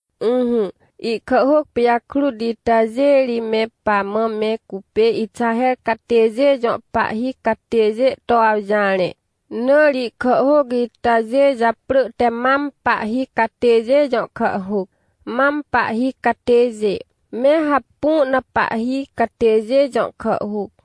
Ỹhỹ, ihkàhhôc pijakrut itajê ri me pamã me cupê Ixaher catêjê jõ pahhi catêjê to awjarẽ, na ri ihkàhhôc itajê japrỳ te Mam Pahhi Catêjê Jõ Kàhhôc ( Pahhi Catêjê) me Hapu na Pahhi Catêjê Jõ Kàhhôc (